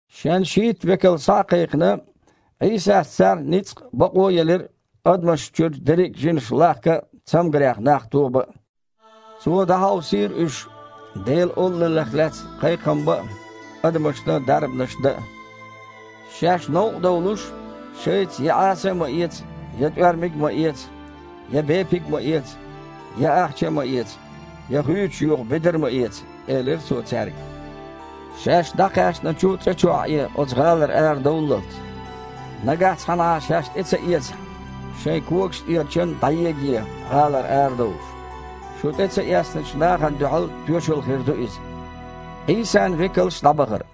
Шен шийтта векал схьа а кхайкхина, Іийсас царна ницкъ а, бакъо а елира адамашна чуьра дерриг жинаш лахка а, цамгарех нах тобан а. Цо дІахьовсийра уьш Делан Олаллех лаьцна кхайкхам бан а, адамашна дарбанаш дан а. «Шаьш новкъа довлуш, шайца я Іаса а ма эца, я тІоьрмаг а ма эца, я бепиг а ма эца, я ахча а ма эца, я хуьйцуш юха бедар а ма эца», – элира Цо цаьрга. «Шаьш дІакхаьчначу цІа чохь Іе, оцу гІалара арадовллалц. Нагахь цхьанхьа шаьш тІе ца эцахь, шайн когаш тІера чан дІаегае, гІалара арадовлуш. Шу тІе ца эцначу нахана дуьхьал тоьшалла хир ду иза». Іийсан векалш дІабахара.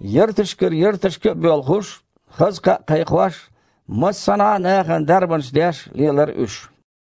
Ярташкара ярташка а боьлхуш, хаза кхаъ кхайкхош, массанхьа а нахана дарбанаш деш лелара уьш.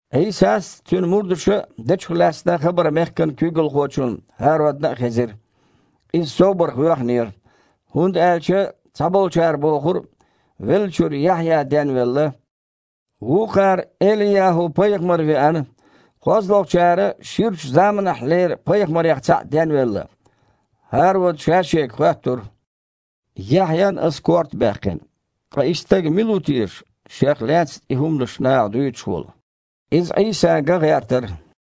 Іийсас а, Цуьнан мурдаша а дечух лаьцна хабар мехкан куьйгалхочунна ХІародна а хезира. Иза собарх воьхнера, хІунда аьлча цхьаболчара бохура веллачуьра Яхьъя денвелла, вукхара – Эли-ЯхІу-пайхамар веана, кхозлагІчара – ширачу заманахьлера пайхамарех цхьаъ денвелла. ХІарода ша-шега хоьттура: «Яхьъян ас корта баьккхина. Ткъа и стаг мила ву теша, шех лаьцна и хІуманаш наха дуьйцуш волу?» Иза Іийса ган гІертара.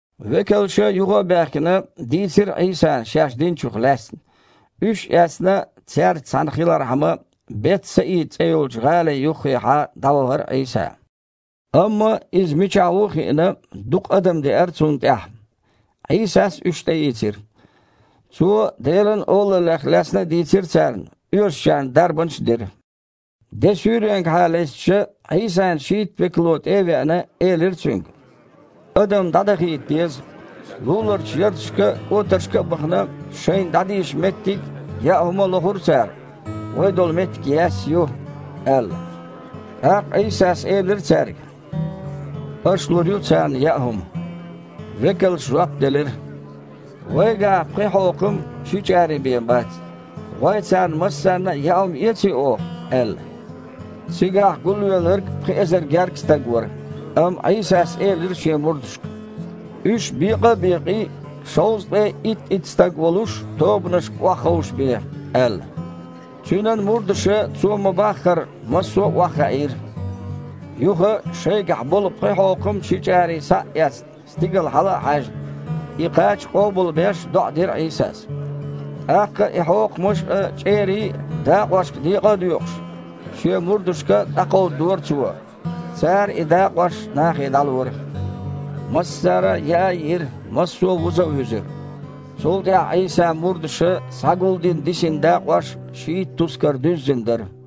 Векалша, юха а баьхкина, дийцира Іийсана шаьш динчух лаьцна. Уьш а эцна, цаьрца цхьаьна хилархьама, Бет-Саида цІе йолчу гІали юххехьа дІавахара Іийса. Амма Иза мичахь ву а хиъна, дукха адам деара Цунна тІаьхьа. Іийсас уьш тІеийцира. Цо Делан Олаллех лаьцна а дийцира царна, оьшучарна дарбанаш а дира. Де суьйренгахьа лестича, Іийсан шийтта векало, тІе а веана, элира Цуьнга: «Адам дІадахийта деза. Луларчу ярташка а, кІотаршка а бахана, шайна дІадийша меттиг а, яа хІума а лохур цара. Вай долу меттиг яьсса ю», – аьлла. ТІаккха Іийсас элира цаьрга: «Аша лур ю царна яа хІума». Векалша жоп делира: «Вайгахь пхи хьокхам, ши чІарий бен бац. ГІой, царна массарна а яа хІума эций оха?» – аьлла. Цигахь гулвелларг пхи эзар гергга стаг вара. Амма Іийсас элира шен мурдашка: «Уьш, бекъа а бекъий, шовзткъе итт-итт стаг волуш тобанашка охьаховшабе», – аьлла. Цуьнан мурдаша Цо ма-баххара массо а охьахаийра. Юха, шайгахь болу пхи хьокхам, ши чІарий схьа а эцна, стигала хьала а хьаьжна, и кхача къобалбеш, доІа дира Іийсас. ТІаккха и хьокхамаш а, чІерий а дакъошка декъа а доькъуш, Шен мурдашка дІакховдадора Цо. Цара и дакъош нахе дІалора. Массара а яа а йиира, массо а вуза а вуьзира. Цул тІаьхьа Іийсан мурдаша схьагулдина дисина дакъош шийтта тускар дуьззина дара.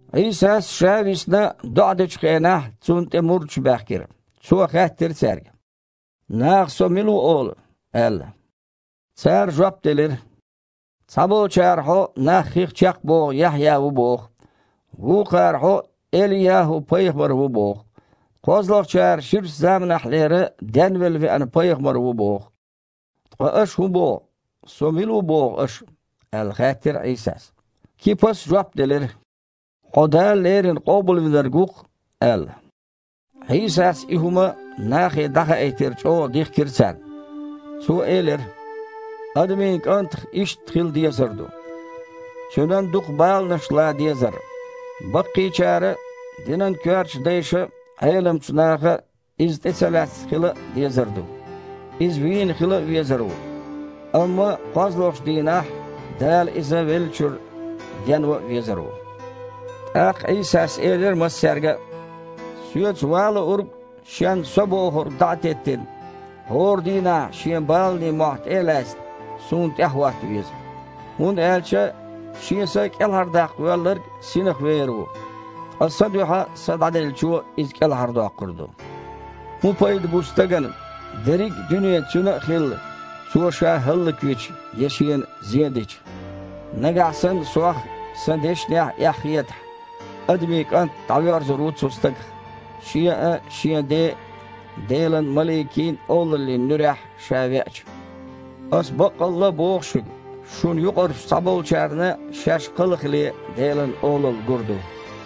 Іийсас, Ша висна, доІа дечу хенахь, Цунна тІе мурдаш баьхкира. Цо хаьттира цаьрга: «Наха Со мила ву олу?» – аьлла. Цара жоп делира: «Цхьаболчара Хьо нах хих чекхбоху Яхьъя ву боху, вукхара Хьо Эли-ЯхІу-пайхамар ву боху, кхозлагІчара ширачу заманахьлера денвелла веана пайхамар ву боху». «Ткъа аша хІун боху, Со мила ву боху аша?» – аьлла, хаьттира Іийсас. Кипас жоп делира: «Хьо Дала леррина Къобалвинарг ву-кх», – аьлла. Іийсас и хІума нахе дІахаийтар чІогІа дихкира царна. Цо элира: «Адамийн КІантах иштта хила дезар ду: Цуьнан дукха баланаш лан дезар, баккхийчара а, динан коьртачу дайша а, Іеламчу наха Иза тІе ца лаьцна хила а дезар ду, Иза вийна хила а везар ву, амма кхозлагІчу дийнахь Дала Иза веллачуьра денван а везар ву». ТІаккха Іийсас элира массаьрга а: «Соьца ван луург, шен „со“ бохург дІа а теттина, хІора дийнахь шен баланийн мохь тІе а лаьцна, Суна тІаьхьахІотта веза. ХІунда аьлча шен са кІелхьардаккха воьлларг синах вер ву, ткъа Сан дуьхьа са дІаделлачо иза кІелхьардоккхур ду. ХІун пайда бу стагана дерриг а дуьне цуьнан а хилла, цо ша хІаллаквича я шена зен дича? Нагахь санна Сох а, Сан дешнех а эхь хетахь, Адамийн КІант дІавоьрзур ву цу стагах, Шен а, Шен Ден а, Делан маликийн а Олаллин нуьрехь Ша веача. Аса баккъалла а боху шуьга: шуна юкъарчу цхьаболчарна шаьш кхалхале Делан Олалла гур ду».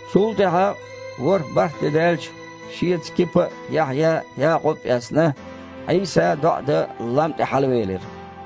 Цул тІаьхьа, ворхІ-бархІ де даьлча, Шеца Кипа а, Яхьъя а, Якъуб а эцна, Іийса доІа дан лам тІе хьалавелира.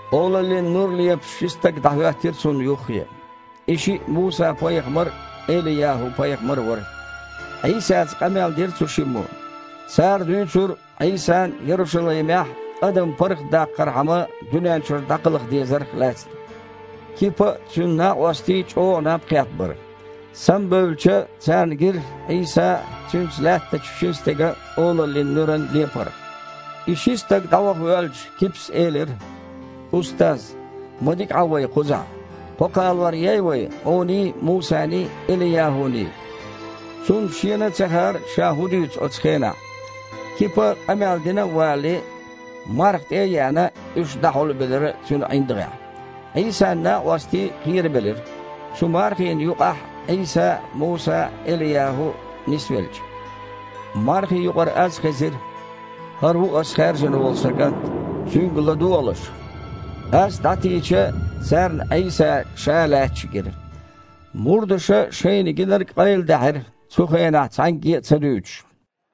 Олаллин нур лепаш ши стаг дІахІоьттира Цунна юххе. И шиъ Муса-пайхамар а, Эли-ЯхІу-пайхамар а вара. Іийсаца къамел дира цу шиммо. Цара дуьйцура Іийсан, Ярушалаймехь, адам паргІатдаккхархьама, дуьнен чуьра дІакхалха дезарх лаьцна. Кипа а, цуьнан накъостий а чІогІа наб кхетта бара. Самабевлча, царна гира Іийсан а, Цуьнца лаьттачу шина стеган а Олаллин нуьран лепар. И ши стаг дІаваха воьлча, Кипас элира: «Устаз! Ма дика Іа вай кхузахь! Кхо кхалор ей вай Хьуний, Мусаний, Эли-ЯхІуний?» Цунна шена а ца хаьара ша хІун дуьйцу оцу хенахь. Кипа къамел дина а валале, марха тІе а еана, уьш дІахьулбелира цуьнан ІиндагІехь. Іийсан накъостий кхерабелира, цу мархина юкъахь Іийса а, Муса а, Эли-ЯхІу а нисвелча. Мархи юкъара аз хезира: «ХІара ву Ас хаьржина волу Сан КІант. Цуьнга ладогІалаш!» Аз дІатийча, царна Іийса ша лаьтташ гира. Мурдаша шайна гинарг къайладаьхьира, цу хенахь цхьаьнгге а ца дуьйцуш.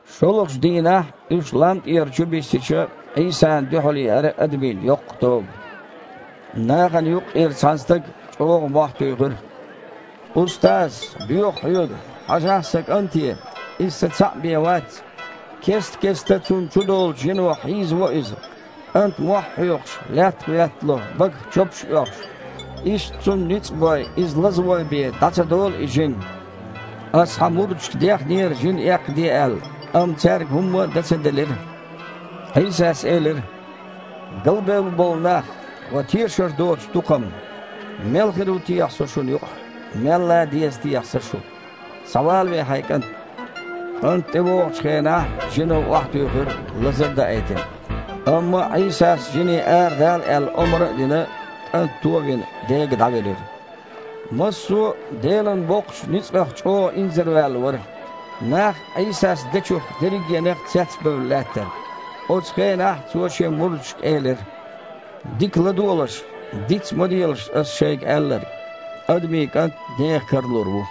ШолгІачу дийнахь, уьш лам тІера чубиссича, Іийсана дуьхьал еара адамийн йоккха тоба. Нахана юккъера цхьана стага чІогІа мохь туьйхира: «Устаз! Доьху Хьоьга, хьажахьа сан кІанте! Иза сан цхьаъ бен вац! Кест-кеста цунна чудолучу жино хьийзаво иза. КІант, мохь хьоькхуш, лаьттах веттало, багах чопаш оьхуш. Иштта цунна ницкъ бой, иза лазавой бен дІа ца долу и жин. Ас Хьан мурдашка дехнера жин эккхаде аьлла, амма цаьрга хІумма а дан ца делира». Іийсас элира: «Галбевлла болу нах! Ва тешар доцу тукхам! Мел хир ву техьа Со шуна юкъахь? Мел лан деза техьа Сан шу? Схьавалаве хьайн кІант!» КІант, тІевогІучу хенахь, жино охьатуьйхира, лазар а даийтина. Амма Іийсас жине арадала аьлла омра а дина, кІант туо а вина, дега дІавелира. Массо а Делан боккхачу ницкъах чІогІа инзарваьлла вара. Нах Іийсас дечух дерригенах цецбевлла лаьттара. Оцу хенахь Цо Шен мурдашка элира: «Дика ладогІалаш, диц а ма делаш Ас шайга аьлларг: Адамийн КІант нехан кара лур ву».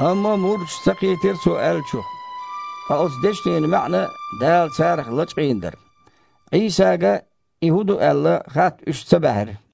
Амма мурдаш ца кхийтира Цо аьллачух. Ткъа оцу дешнийн маьІна Дала царах лачкъийна дара. Іийсага, и хІун ду аьлла, хатта уьш ца баьхьира.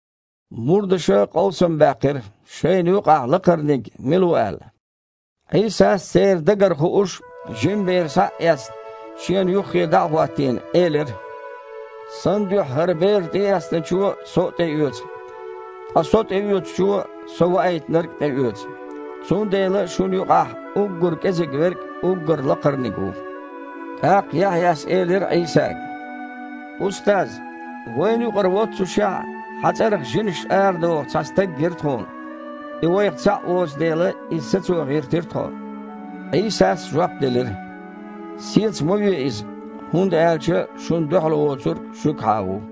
Мурдаша къовсам баьккхира, шайна юкъахь лакхарниг мила ву аьлла. Іийсас, церан дагара хууш, жима бер схьа а эцна, Шена юххе дІа а хІоттийна, элира: «Сан дуьхьа хІара бер тІеэцначо Со а тІеоьцу. Ткъа Со тІеоьцучо Со Ваийтинарг а тІеоьцу. Цундела шуна юкъахь уггар кІезиг верг а уггар лакхарниг ву». ТІаккха Яхьъяс элира Іийсага: «Устаз! Вайна юкъара воццушехь а, Хьан цІарах жинаш арадоху цхьа стаг гира тхуна. И вайх цхьаъ воцу дела, иза сацо гІиртира тхо». Іийсас жоп делира: «Сеца ма ве иза! ХІунда аьлча шуна дуьхьал воцург шуьгахьа ву!»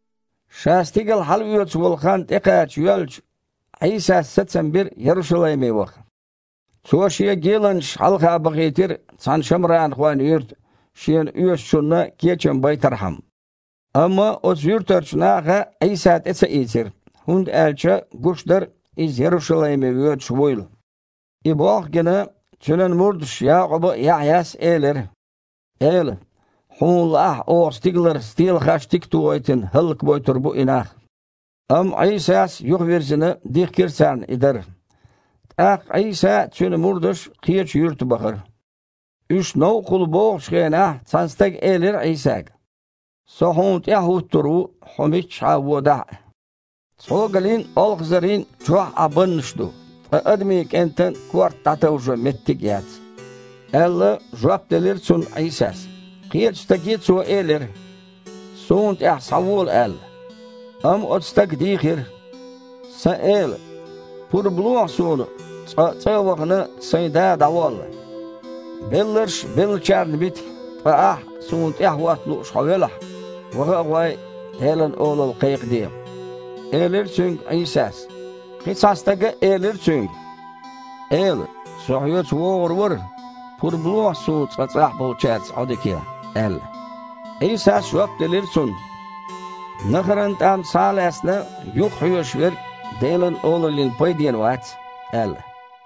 Ша стигала хьалаоьцу волу хан тІекхача йоьлча, Іийсас сацам бира Ярушалайме ваха. Цо Шен геланчаш хьалха бахийтира цхьана шамранхойн юьрта, Шена оьшучунна кечам байтархьама. Амма оцу юьртарчу наха Іийса тІе ца ийцира, хІунда аьлча гуш дара Иза Ярушалайме воьдуш вуйла. И болх а гина, Цуьнан мурдаша Якъуба а, Яхьъяс а элира: «Эла! Хьуна лаахь, оха стигалара стелахаьштиг а тохийтина, хІаллакбойтур бу и нах». Амма Іийсас, юхавирзина, дихкира царна и дар. ТІаккха Іийса а, Цуьнан мурдаш а кхечу юьрта бахара. Уьш новкъахула богІучу хенахь, цхьана стага элира Іийсага: «Со Хьуна тІаьхьа хІуттур ву, Хьо миччахьа а водахь а». «Цхьогалийн а, олхазарийн а чохь Іан баннаш ду, ткъа Адамийн КІентан корта дІатовжо меттиг а яц», – аьлла, жоп делира цунна Іийсас. Кхечу стаге Цо элира: «Суна тІаьхьа схьавола!» – аьлла. Амма оцу стага дийхира: «Сан Эла! Пурба лохьа суна, цкъа, цІа а вахана, сайн да дІаволла». «Белларш беллачарна бита, ткъа ахь, Суна тІаьхьахІотта лууш хьо велахь, ваха а гІой, Делан Олалла кхайкхаде», – элира цуьнга Іийсас. Кхин цхьана стага элира Цуьнга: «Эла! Со Хьоьца вогІур вара, пурба лохьа суна цкъа цІахь болчаьрца Іодика ян», – аьлла. Іийсас жоп делира цунна: «Нахаран тІам схьа а лаьцна, юхахьоьжуш верг Делан Олаллина пайденна вац», – аьлла.